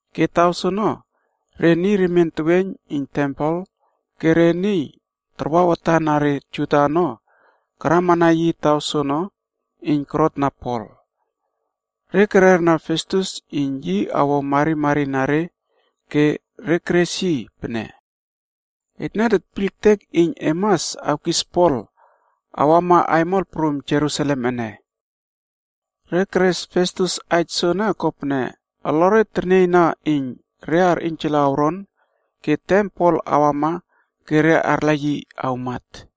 Ke taw soono, re niy remien teweiyn iyn tempel pe re niy tarwa watan na re Juda ono karamana yi taw soono iyn korot empema Pol ono. Re kererna Festus iyn yi awo marimari na re ke re keres yi pene, “Etne tetpiyl ektek iyn e mas awkis Pol awama aimol prum Jerusalem ene.” Re keres Festus aij soene kopene olore ternieyna iyn re arꞌiynjala awron ke tem Pol awama ke re arla yi awmat.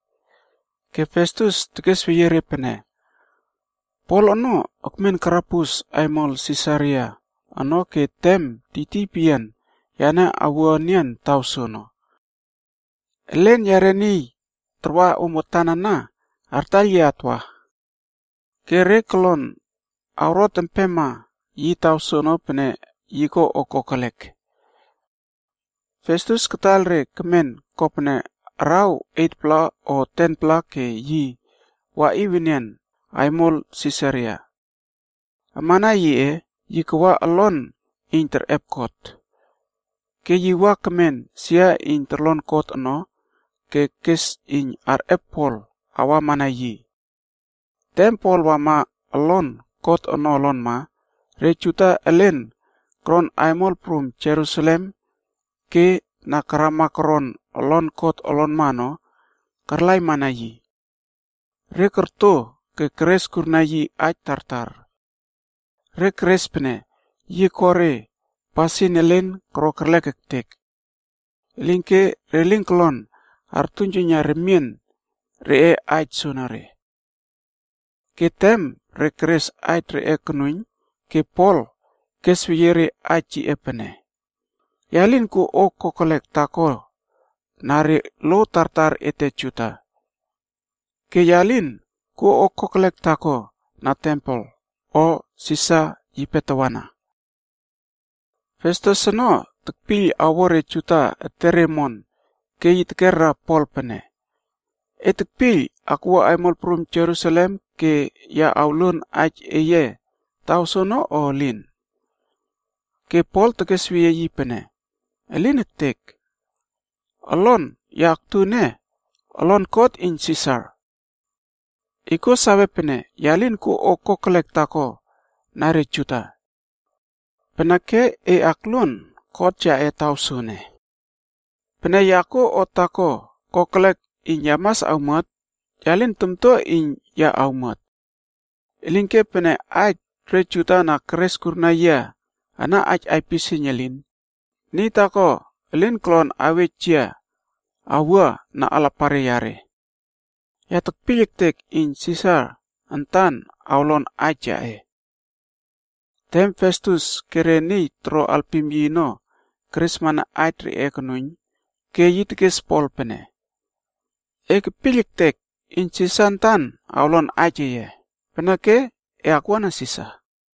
Ke Festus tekesweyie re pene, “Pol ono ekmen karabus aimol Sisaria ono ke tem tiytiy peyian yane awua enian taw soono. Elen yare niy tarwa om watan ana artaiyl yia atwa. Ke re kolon awrot empema yi taw soono pene yi ko o kokelek.” Festus kataiyl re kemen kopene araw 8-pla o 10-pla ke yi waꞌiw enian aimol Sisaria. Amana yiꞌe, yi kawa olon iyn terꞌep kot. Ke yi wa kemen sia iyn torlon kot ono ke kes iyn arꞌep Pol awamana yi. Tem Pol wama olon kot ono olonma, re Juda elen koron aimol prum Jerusalem ke na karama koron olon kot olonma ono karlaimana yi. Re korto ke keres kurna yi aij tartar. Re keres pene yi koro re pasin elen koro kerlek ektek. Elinke re lin kolon artuiynjuiyna remien reꞌe aij soonore. Ke tem re keres aij reꞌe konuiyn ke Pol kesweyie re aij yiꞌe pene, “Ya lin kuo o kokelek taako na re lo tartar ete Juda. Ke ya lin kuo o kokelek taako na tempel, o Sisar yipe tawana.” Festus ono espaij re Juda ono ke tekpiyl awo re Juda etere omon ke yi tekera Pol pene, “E tekpiyl akwua aimol prum Jerusalem ke ya awluon aij eye taw soono o elin?” Ke Pol tekesweyie yi pene, “Elin ektek! Olon ya aktu ene, olon kot iyn Sisar. E kuo sawe pene ya lin kuo o kokelek taako na re Juda. Peneke e akluon kot yaꞌe taw soene. Pene ya kuo o taako kokelek iyn ya mas awmuat, ya lin tamtua iyn ya awmuat. Elinke pene aij re Juda na keres kurna yia ana aipisieiyn elin, niy taako elin kolon awej yia awua na alapare yare. Ya tekpiyl ektek iyn Sisar antan awlon aij yaꞌe.” Tem Festus ke re niy toro alpim yi ono keresmana aij reꞌe konuiyn, ke yi tekes Pol pene, “E kepiyl ektek iyn Sisar antan awlon aij eye, peneke e akwuana Sisar.”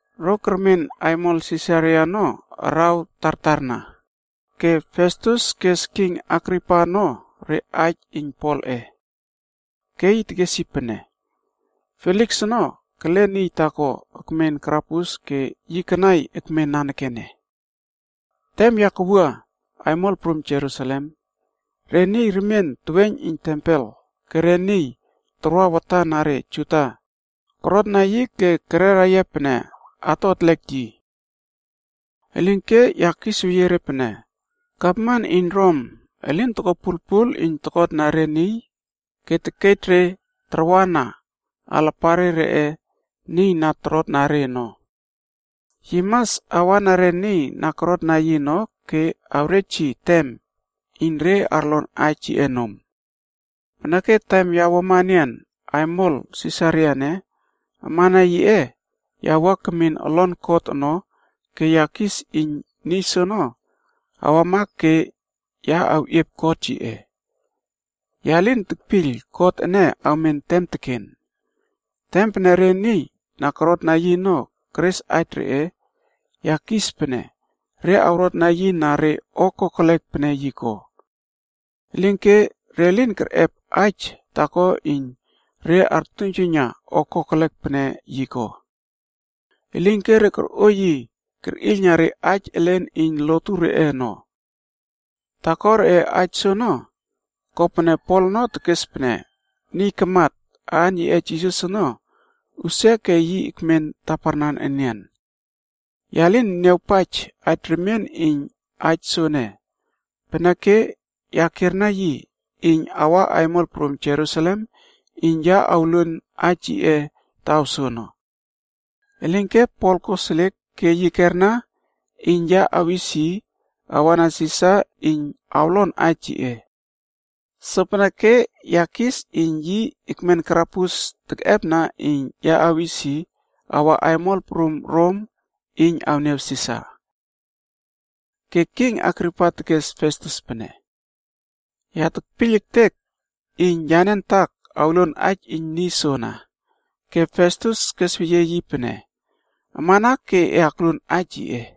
Ro kermen aimol Sisaria ono araw tartarna, ke Festus kes king Agripa ono re aij iyn Polꞌe. Ke yi tekes yi pene, “Feliks ono kele niy taako ekmen karabus ke yi kanai ekmen nanekene. Tem ya kawua aimol prum Jerusalem, re niy remien teweiyn iyn tempel ke re niy tarwa watan na re Juda korotna yi ke kerera pene ato etlek yi. “Elinke ya kisweyie re pene, Gavman iyn Rom elin toko pulpul iyn tokotna re niy ke tekej re tarwana alapan reꞌe niy na torotna re ono. Yi mas awa na re niy na korotna yi ono ke awrej yi tem iyn re arlon aij yiꞌe nom. Peneke tem ya wuama enian aimol Sisaria ene, amana yiꞌe ya wua kemin olon kot ono ke ya kis iyn niy soono wama ke ya keꞌiep kot yiꞌe. Ya lin tekpiyl kot ene awmen tem teken. Tem pene re niy na korotna yi ono keres aij reꞌe, ya kis pene re awrotna yi na re o kokelek pene yi ko. Elinke re lin kerꞌep aij taako iyn re artuiynjuiyna o kokelek pene yi ko. Elinke re korꞌo yi kerꞌiylna re aij elen iyn lotu reꞌe ono. Taako reꞌe aij soono, kopene Pol ono tekes pene niy kamat, aan yiꞌe Jisas ono, usia ke yi ekmen taparnan enian. Ya lin niawpaij aij remien iyn aij soene, peneke ya kierna yi iyn awa aimol prum Jerusalem iyn ya awluon aij yiꞌe taw soono. Elinke Pol koseliek ke yi kerna iyn ya awis yi awa na Sisar iyn awlon aij yiꞌe. Sopeneke ya kis iyn yi ekmen karabus tekꞌepna iyn ya awis yi awa aimol prum Rom iyn awniaw Sisar.” Ke king Agripa tekes Festus pene, “Ya tekpiyl ektek iyn yane antak awluon aij iyn niy soana.” Ke Festus tekesweyie yi pene, “Amana ke e akluon aij yiꞌe.”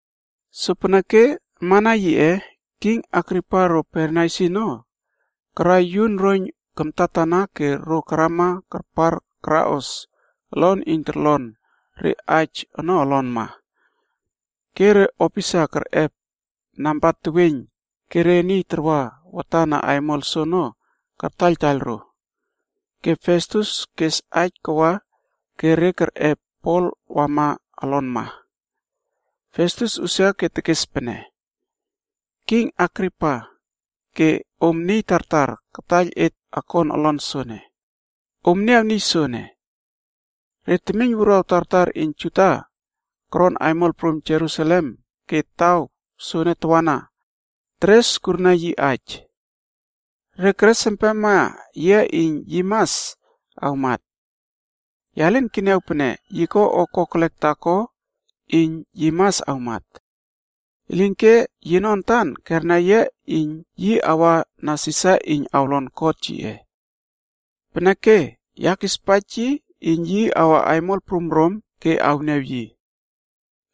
Sopeneke amana yiꞌe, king Agripa ro Bernaisi ono karai yun roiyn kamtatana ke ro karama karpar karaꞌos olon iyn torlon re aij ono olonma. Ke re opisa kerꞌep namba teweiyn ke re niy tarwa watan na aimol soono kartaiyltaiyl ro. Ke Festus kes aij kawa ke re kerꞌep Pol wama olonma. Festus usia ke tekes pene, “King Agripa ke om niy tartar kataiyl et akon olon soene, om niaw niy soene. Re temiyn wuruaw tartar iyn Juda koron aimol prum Jerusalem ke taw soene tawana, teres kurna yi aij. Re keres empema yia iyn yi mas awmat. Ya lin keniaw pene yi ko o kokelek taako iyn yi mas awmat. Elinke yino antan kerna iyn yi awa na Sisar iyn awlon kot yiꞌe. Peneke ya kispaij yi iyn yi awa aimol prum Rom ke awniaw yi.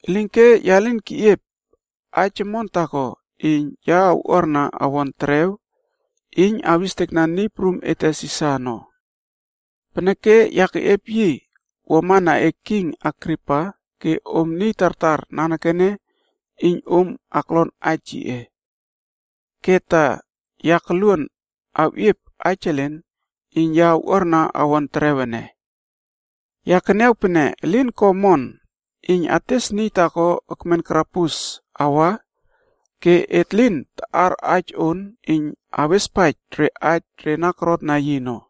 Elinke ya lin keꞌiep aij omon taako iyn ya awꞌuarna awon terew iyn awestekna niy prum ete Sisar ono. Peneke ya keꞌiep yi wamana e king Agripa ke om niy tartar nanekene iyn om aklon aij yiꞌe. Ke ta ya koluon awꞌiep aij elen iyn ya awꞌuarna awon terew ene. Ya keniaw pene elin ko omon iyn ates niy taako ekmen karabus ene awa ke et lin taꞌar aij on iyn awespaij re aij re na korotna yi ono.”